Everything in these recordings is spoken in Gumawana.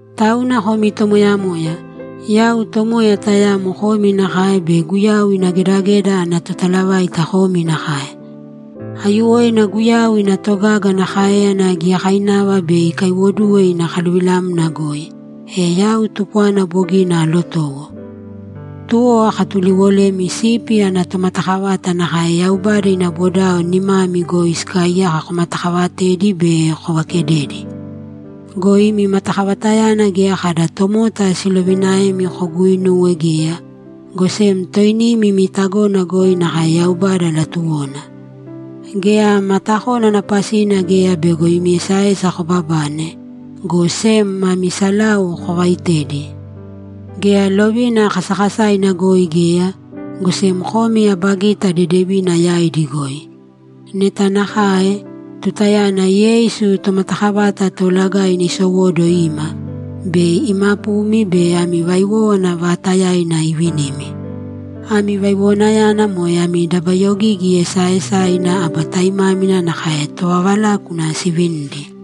Tauna komi tomoyamoya, yau tomoya tayamo komi nakae be Guyau ina gedageda ana totalavaita komi nakae. Aiyuwoina Guyau ina togaga ana káeyana giyakainava bei ikaiwoduwe ina kaluvilamna goi, e yau tupwana bogina aalotowo. Tuwo akatuliwolemi sipi ana tomatakavata nakae Yaubada ina bodao nimami goi sikaaiyaka komatakaavatēdi be kovaakedēdi. Go imi matakavatayana geya kada tomota siloviinaemi koguuinuwe geya, go sem toinimi imi tagona goi nakae Yaubada latuwona. Geya matakónana pasina geya bego imi esaesa kobabane, go sem mami salau kovaaitēdi. Geya lovina kasakasaina goi geya, go sem komi aba gita dedevina yaidi goi. Neta nakae, tutayana Yeisu Tomatakavata Toolagaina isowóduwo ima, bei imapumi be ami vaiwówana vaatayaina ivinimi. Ami vaiwowanayana moe ami dabayogigi esaaesaina aba taimámina nakae tovavalákuna sivinidi.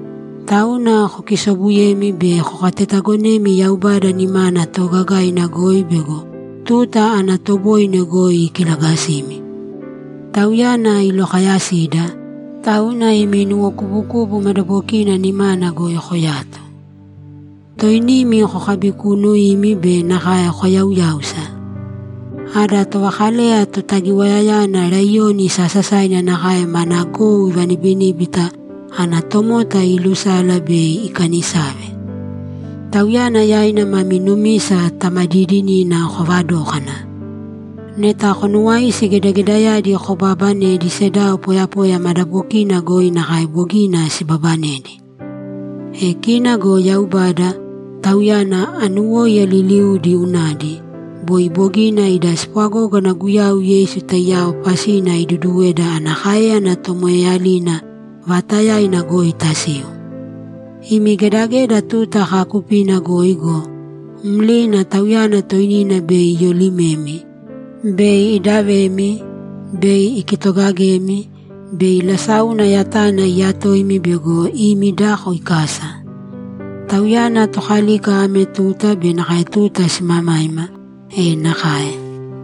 Tauna kokisoobuyēmi be kokatetaagonēmi Yaubada nimana toogagaina goi bego tuta ana toboine goi ikilagasimi. Tauyana ilokayasida, tauna imi nuwokubukubu madabokina nimana goi koyāto. Toinimi kokabikuunuīmi be nakae koyauyāusa. Ada tovakaleya Totagiwayayana laiyoni sasasaina nakae mana gou ivanibiníbita ana tomota ilusala bei ikanisave. Tauyana yaina mami numisa tamadiidinina kovadōkana. Neta konuwaisi gedagedayadi kobaabanedi sedao poyapoya madabokiina goi nakae bogina sibabanedi. E kina go Yaubada, Tauyana anuwóiya liliudi unadi, boi bogina ida spwagógana Guyau Yeisu taiyao pasina iduduweda ana káeyana tomoeeyalina vaatayaina goi tasiu. Imi gedageda tuta kaakupina goi go, mlina Tauyana toinina bei iyolimemi, bei idavemi, bei ikitogagemi, bei lasáuna yatana iyatoimi bego imi dako ikasa. Tauyana Tokalika ame tuta be nakae tuta simamaima! E nakae!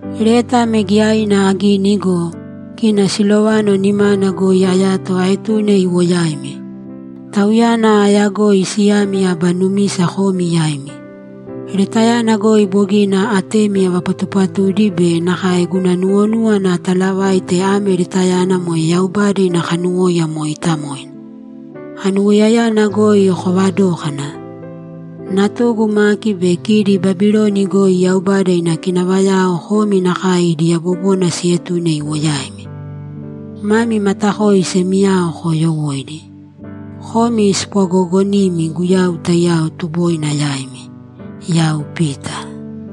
Leta ame giyaina agini go, kina Silovano nimana goi ayato aetune iwo yaimi. Tauyana aayagoi siyami aba numisa komi yaimi. Letayana goi bogina atemi avapatupatudi be nakae guna nuwonúwana atalavaite ame letayana moe Yaubada ina kanuwóiya mooitamoina. Anuwoiyayana goi koovadōkana! Natugu Maki be kidi Babiloni goi Yaubada ina kinavayao komi nakae idi yabobona sietune iwo yaimi. Mami matakoi semiyao koyoowoiīdi. Komi spwagoogonimi Guyau taiyao tuboina yaimi! Yau Pita